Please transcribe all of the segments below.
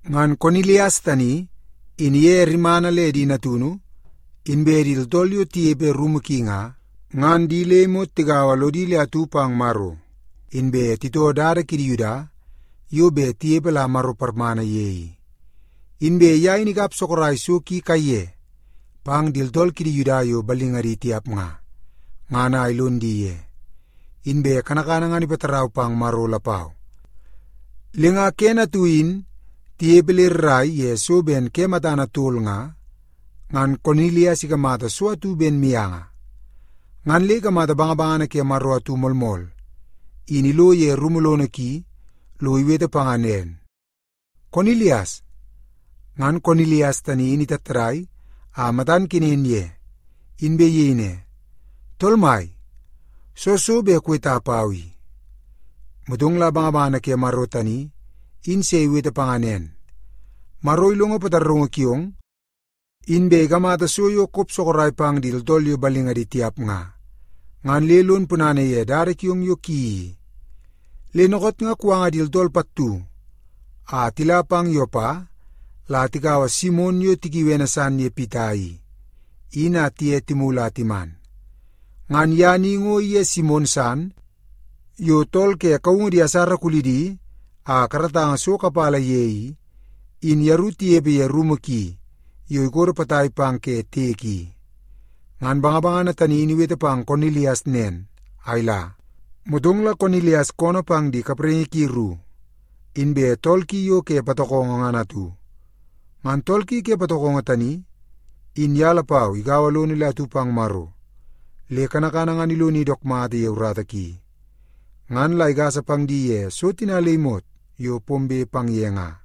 Ngan Konilias tani in iye rimana le di natunu, inbe di tooltool yo tinepe rumu ki nga, ngan di le imot tigaua lodi le atu pang Maro, inbe titoo dada kidi Yuda yo bet tinepe la Maro parmana ye i. Inbe ye in ikap sorok so ki kaiye pang di tooltool kidi Yuda yo ballingadi tiap nga, ngan a ilon di ye. Inbe kanakana ngan ipatarau pang Maro lapau. Le nga kene atu in tinepe le rrai ye so ben ke matana tol nga, ngan Konilias ikamata so atu ben mianga. Ngan le ikamata bangabangana ke Maro atu moolmool in ilo ye rumu lono ki lo iwete panga nen, “Konilias!” Ngan Konilias tani in itattadai a matan kenen ye, inbe iyei ne, “Tool mai, soo so bet kuweta pau i?” Motong la bangabangana ke Maro tani in se iwete panga nen, “Maro ilongo pataraungu kiong, inbe ikamata so yo kop sorok pang di tooltool yo ballingadi tiap nga, ngan le lon ponana ye dada kiong yo kuyeii i. Le dookoot nga kuwanga di tooltool pattu a tila pang Yopa la tikaua Simon yo tikiui ene san ye Pita i, in a tiye timulu a timan. Ngan ye ni ngo iye Simon san yo tool ke kaungu di asara kulidi a karatanga so kapala ye i, in yeru tinepe ye rumu ki yo ikodo potai pang ke tiek i.” Ngan bangabangana tani in iwete pang Konilias nen a ila. Motong la Konilias koonoo pang di kapraingi ki ru, inbe tool ki yo ke patokongo ngan atu. Ngan tool ki ke patokongo tani, in ye lapau igaua lono le atu pang Maro, le kanakana ngan iloni dook mata ye urata ki. Ngan la igasa pang di ye so tina le imot yo pombe pang ye nga,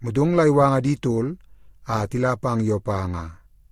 motong la iwanga di tol a tila pang Yopa nga.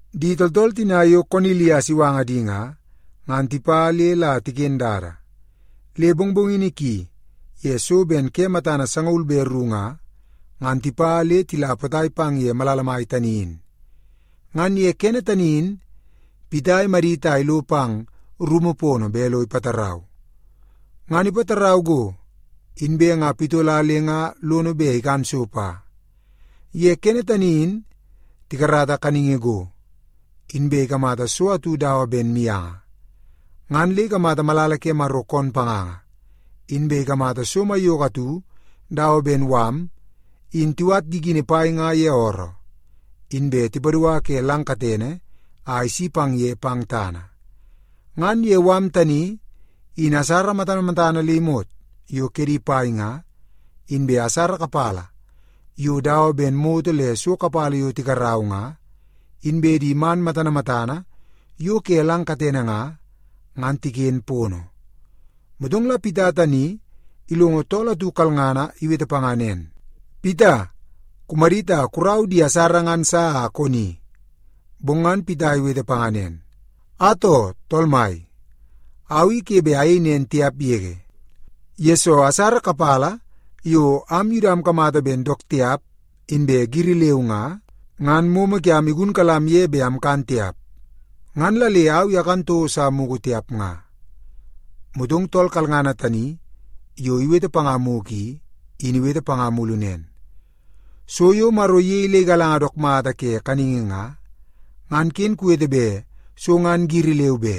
Di tooltool tina yo Konilias iwanga di nga, ngan tipa le la tiken dada. Le mongmongini ki ye so ben ke matana sangaul be ru nga, ngan tipa le tila potai pang ye malala mai tani in. Ngan ye kene tani in Pita imadit a ilo pang rumu pono bet lo ipatarau. Ngan ipatarau go, inbe nga pitola le nga lono bet ikan so pa. Ye kene tani in tikarata kaningi go, inbe ikamata so atu dawa ben mianga. Ngan le ikamata malala ke Maro koon panganga, inbe ikamata so maiyoko atu dawa ben mala in tiwat gigini pai nga ye ooroo, inbe tipadua ke lang katene a isi pang ye pang tana. Ngan ye mala tani, in asara matana matana le imot yo kedi pai nga, inbe asara kapala yo dawa ben moto le so kapala yo tikarau nga, inbe di man matana matana yo ke lang katene nga, ngan tiken pono. Motong la Pita tani ilongo tool atu kalngana iwete panga nen, “Pita, kumadit a kurau di asara ngan sa a koni.” Bong ngan Pita iwete panga nen, “Atoo, Tool Mai! Au i ke bet ayei nen tiap yege, yesoo asara kapala yo am Yuda amkamata ben dook tiap inbe giri leu nga, ngan momo kiam igunkalam ye bet amkan tiap. Ngan la le au i akan toko sa mugu tiap nga.” Motong tool kalngana tani yo iwete panga mugu i, in iwete panga mulu nen, “So yo Maro iyei le igalanga dook mata ke kaningi nga, ngan ken kuwete bet so ngan giri leu be.”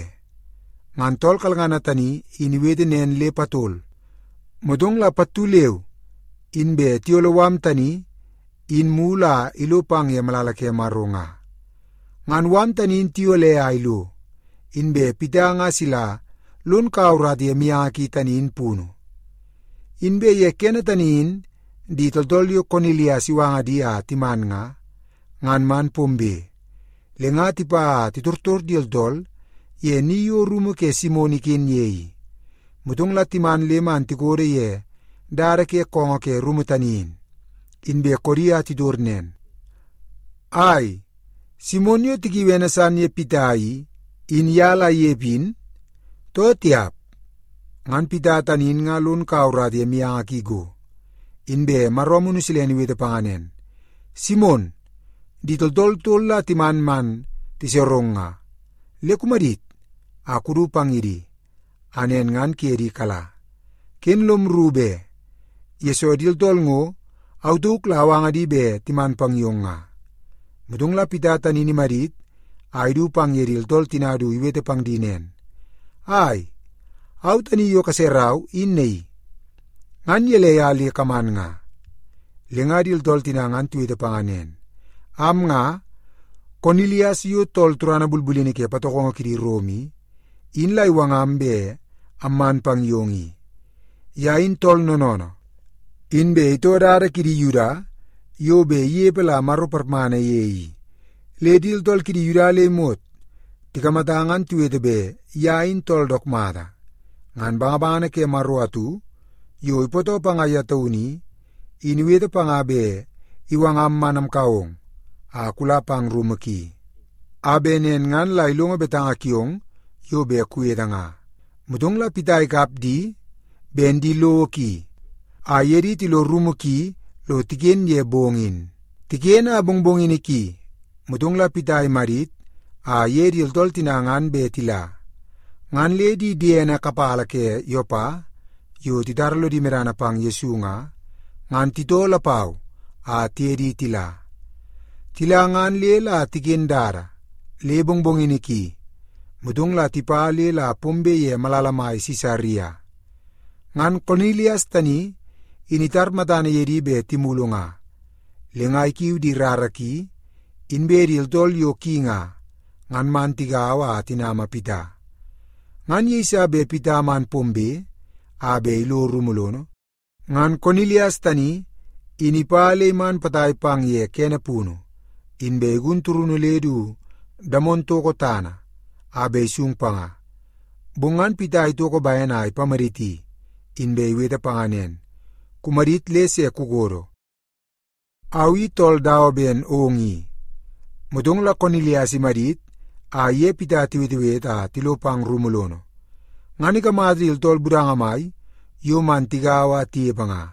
Ngan tool kalngana tani in iwete nen le patol, motong la pattu leu inbe tiyolo mala tani in mulu a ilo pang ye malala ke Maro nga. Ngan mala tani in tiyole a ilo, inbe Pita nga sila lon kaua urata ye mianga ki tani in punu. Inbe ye kene tani in di tooltool yo Konilias iwanga di a timan nga, ngan man pombe. Le nga tipa a titortor di tooltool ye ni yo rumu ke Simon iken ye i, motong la timan le man tikodo ye dada ke koongoo ke rumu tani in. Inbe koodi a titor nen, “Ai, Simon yo tikiui ene san Pita i, in ye la inepe in, too tiap?” Ngan Pita tani in nga lon kaua urata ye mianga ki go, inbe Maro Amunu Silene iwete panga nen, “Simon, di tooltool tol la timan man tiserong nga. Le kumadit a kudu pang ye di, a nen ngan kuye di kala. Ken lom rru be, yesoo di tooltool ngo au tauk la awanga di bet timan pang yong nga.” Motong la Pita tani in imadit a idu pang ye di tooltool tina du iwete pang di nen, “Ai, au tani yo kaserau in naii. Ngan gelei a le kaman nga?” Le nga di tooltool tina ngan tiwete panga nen, “Am nga, Konilias yo tool turana bulbulini ke patokongo kidi Rom i, in la iwangam bet amman pang yong i. Ye in tool noonoonoo, inbe itoo dada kidi Yuda yo bet inepe la Maro parmana ye i, le di tooltool kidi Yuda le imot tikamata ngan tiwete bet ye in tool dook mata. Ngan bangabangana ke Maro atu, yo ipootoo panga ye taunu i, in iwete panga bet iwangam man amkau ong a kula pang rumu ki, a bet nen ngan la ilongo betanga kiong yo bet kuwete nga.” Motong la Pita ikap di ben di lowo ki a iye di tilo rumu ki lo tiken ye bong in. Tiken a mongmongini ki, motong la Pita imadit a iye di tooltool tina ngan bet tila, ngan le di diene kapala ke Yopa yo titara lodi medana pang Yesu nga, ngan titoo lapau a tiye di tila. Tila ngan le la tiken dada, le mongmongini ki, motong la tipa le la pombe ye malala mai Sisaria. Ngan Konilias tani in itar matana ye di bet timulu nga, le nga ikiu di rara ki, inbe di tooltool yo ki nga, ngan man tigaua a tinama Pita. Ngan yeiso bet Pita man pombe a bet ilo rumu lono, ngan Konilias tani in ipa le iman potai pang ye kene punu, inbe igun turunu le du damon toko tana, a bet isung panga. Bong ngan Pita itoko bene a ipamaditi, inbe iwete panga nen, “Kumadit le se kukodo. Au i tool dawa ben ong i.” Motong la Konilias imadit a iye Pita tiwetewete a tilo pang rumu lono, ngan ikamata di tooltool budanga mai yo man tigaua a tinepe nga.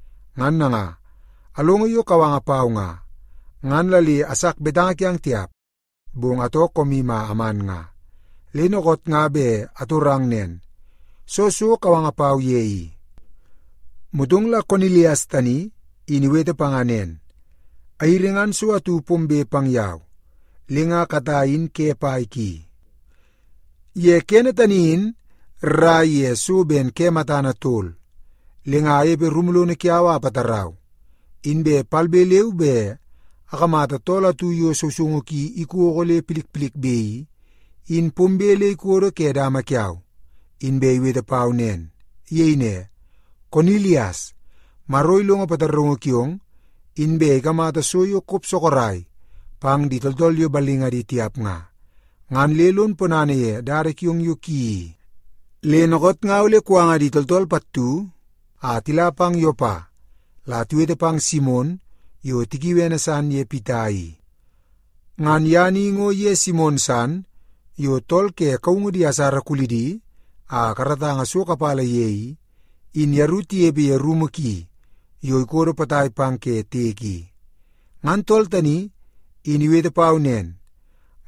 Ngan nanga, alongo yo kawanga pau nga, ngan la le asak betanga kiang tiap, bong atoo koomu a aman nga. Le dookoot nga bet atorang nen, soo so kawanga pau ye i?” Motong la Konilias tani in iwete panga nen, “Airi ngan so atu pombe pang yau, le nga katai in ke pai ki. Ye kene tani in rrai ye so ben ke matana tol, le nga anepe rumu lono kiau a apatarau, inbe palbe leu be akamata tool atu yo sousoungu ki ikoko le milmilbe i, in pombe le ikodo ke dama kiau, inbe iwete pau nen. Iyei ne, ‘Konilias! Maro ilongo pataraungu kiong, inbe ikamata so yo kop sorok pang di tooltool yo ballingadi tiap nga, ngan le lon ponana ye dada kiong yo kuyeii i. Le dookoot nga ole kuwanga di tooltool pattu a tila pang Yopa la tiwete pang Simon yo tikiui ene san Pita i. Ngan ye ni ngo iye Simon san yo tool ke kaungu di asara kulidi a karatanga so kapala ye i, in yeru tinepe ye rumu ki yo ikodo potai pang ke tiek i.’ Ngan tool tani in iwete pau nen,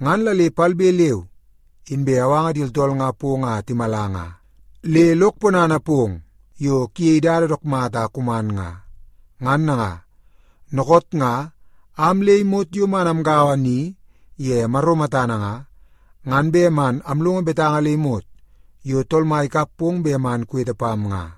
ngan la le palbe leu inbe awanga di tooltool nga pong a timala nga. Le lok ponana pong yo kuyei dada dook mata a kuman nga. Ngan nanga, dookoot nga am le imot yo man amgaua ni ye Maro matana nga, ngan bet man amlongo betanga le imot yo Tool Mai ikap pong bet man kuwete pam nga.”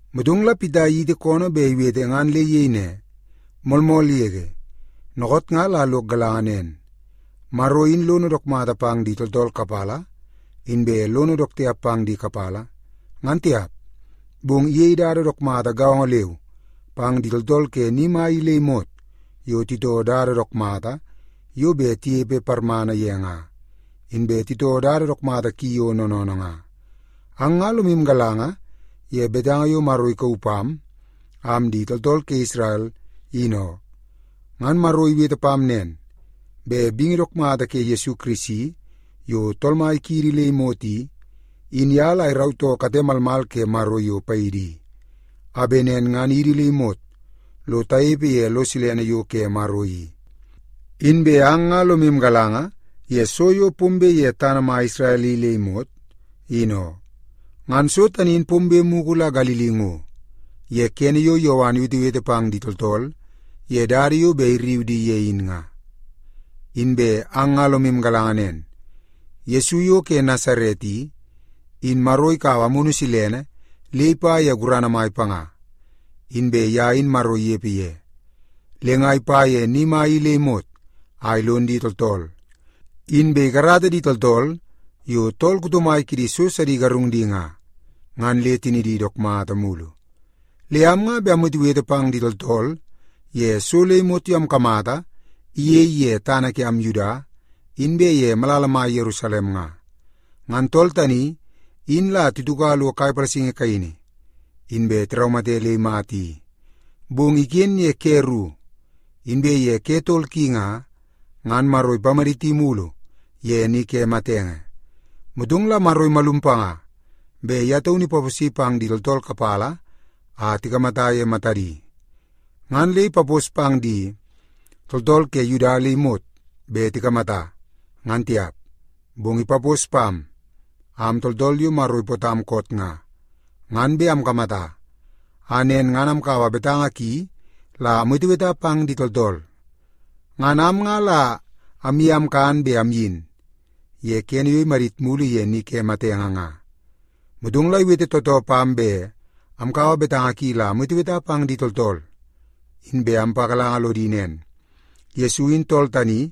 Motong la Pita iyiti koonoo bet iwete ngan le iyei ne, “Moolmool yege, dookoot nga la lok galanga nen, Maro in lono dook mata pang di tooltool kapala, inbe lono dook tiap pang di kapala, ngan tiap. Bong iyei dada dook mata gaongo leu pang di tooltool ke ni mai i le imot yo titoo dada dook mata yo bet tinepe parmana ye nga, inbe titoo dada dook mata ki yo noonoonoo nga. Ang nga lomu galanga ye betanga yo Maro ikauu pam, am di tooltool ke Isrel, in oo. Ngan Maro iwete pam nen, bet bingi dook mata ke Yesu Kirisi yo Tool Mai kiidi le imot i, in ye la irautoo kate malmal ke Maro yo paidi i, a bet nen ngan idi le imot lo tanepe ye lo silene yo ke Maro i. Inbe ang nga lomu galanga ye so yo pombe ye tana mai Isrel i le imot, in oo. Ngan so tani in pombe mugu la Galili ngo, ye kene yo Yowan iwetewete pang di tooltool ye dada yo bet irriu di ye in nga. Inbe ang nga lomu galanga nen, Yesu yo ke Nasaret i, in Maro ikaua Amunu Silene le ipa ye gurana mai panga. Inbe ye in Maro inepe ye, le nga ipa ye ni mai i le imot a ilon di tooltool, inbe ikarata di tooltool yo tool kuto mai kidi so sidi igarung di nga, ngan le tinidi dook mata mulu. “Le am nga bet amwetewete pang di tooltool ye so le imot yo amkamata iyei ye tana kiam Yuda, inbe ye malala mai Yerusalem nga. Ngan tool tani in la tituka lo kai palasingi kaini, inbe tiraumate le imata i. Bong iken ye ke ru, inbe ye ke tol ki nga, ngan Maro ipamaditi mulu ye ni ke matenge. Motong la Maro imalum panga bet ye taunu ipaposi pang di tooltool kapala a tikamata ye matadi. Ngan le ipapos pang di tooltool ke Yuda le imot bet tikamata, ngan tiap, bong ipapos pam, am tooltool yo Maro ipootam koot nga, ngan bet amkamata, a nen ngan amkaua betanga ki la amweteweta pang di tooltool. Ngan am nga la amye amkan be amyin, ye kene yo imadit mulu ye ni ke matenge nga. Motong la iwete tootoo pam bet amkaua betanga ki la amweteweta pang di tooltool, inbe ampagalanga lodi nen, ‘Yesu in tool tani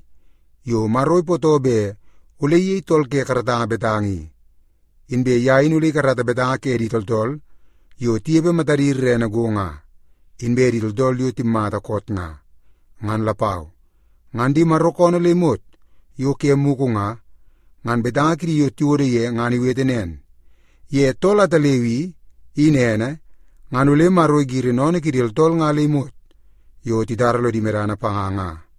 yo Maro ipootoo bet ole iyei tool ke karatanga betanga i, inbe ye in ole ikarata betanga ke di tooltool yo tinepe matadi rerene go nga, inbe di tooltool yo timmata koot nga, ngan lapau.’ Ngan di Maro koonoo le imot yo ke mugu nga, ngan betanga kidi yo tiwodo ye ngan iwete nen, ‘Ye tool ataleu i, in ene, ngan ole Maro igiri sennene kidi tooltool nga le imot yo titara lodi medana panga nga.’”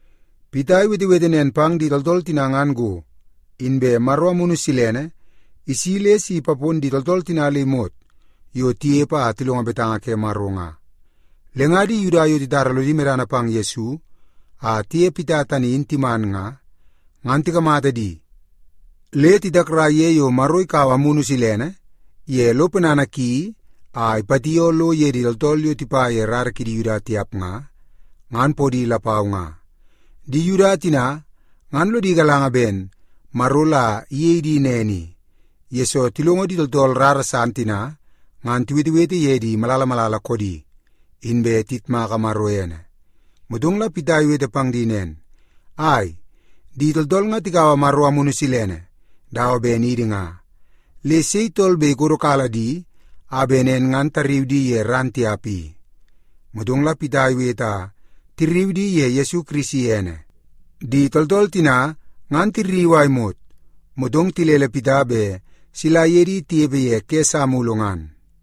Pita iwetewete nen pang di tooltool tina ngan go, inbe Maro Amunu Silene isi le si ipapon di tooltool tina le imot yo tinepe a tilongo betanga ke Maro nga. Le nga di Yuda yo titara lodi medana pang Yesu a tiye Pita tani in timan nga, ngan tikamata di le titakrai ye yo Maro ikaua Amunu Silene ye lo ponana ki a ipatioo lo ye di tooltool yo tipa ye rara kidi Yuda tiap nga, ngan podi lapau nga. Di Yuda tina ngan lodi galanga ben Maro la iyei di nen i, yesoo tilongo di tooltool rara san tina ngan tiwetewete ye di malala malala koodi, inbe tiyitmaka Maro ene. Motong la Pita iwete pang di nen, “Ai, di tooltool nga tikaua Maro Amunu Silene dawa ben idi nga. Le sei tool bet ikodokala di, a bet nen ngan tarriu di ye ran tiap i?” Motong la Pita iwete a tirriu di ye Yesu Kirisi ene. Di tooltool tina ngan tirriu a imot, motong tilele Pita bet sila iye di tinepe ye ke sa mulu ngan.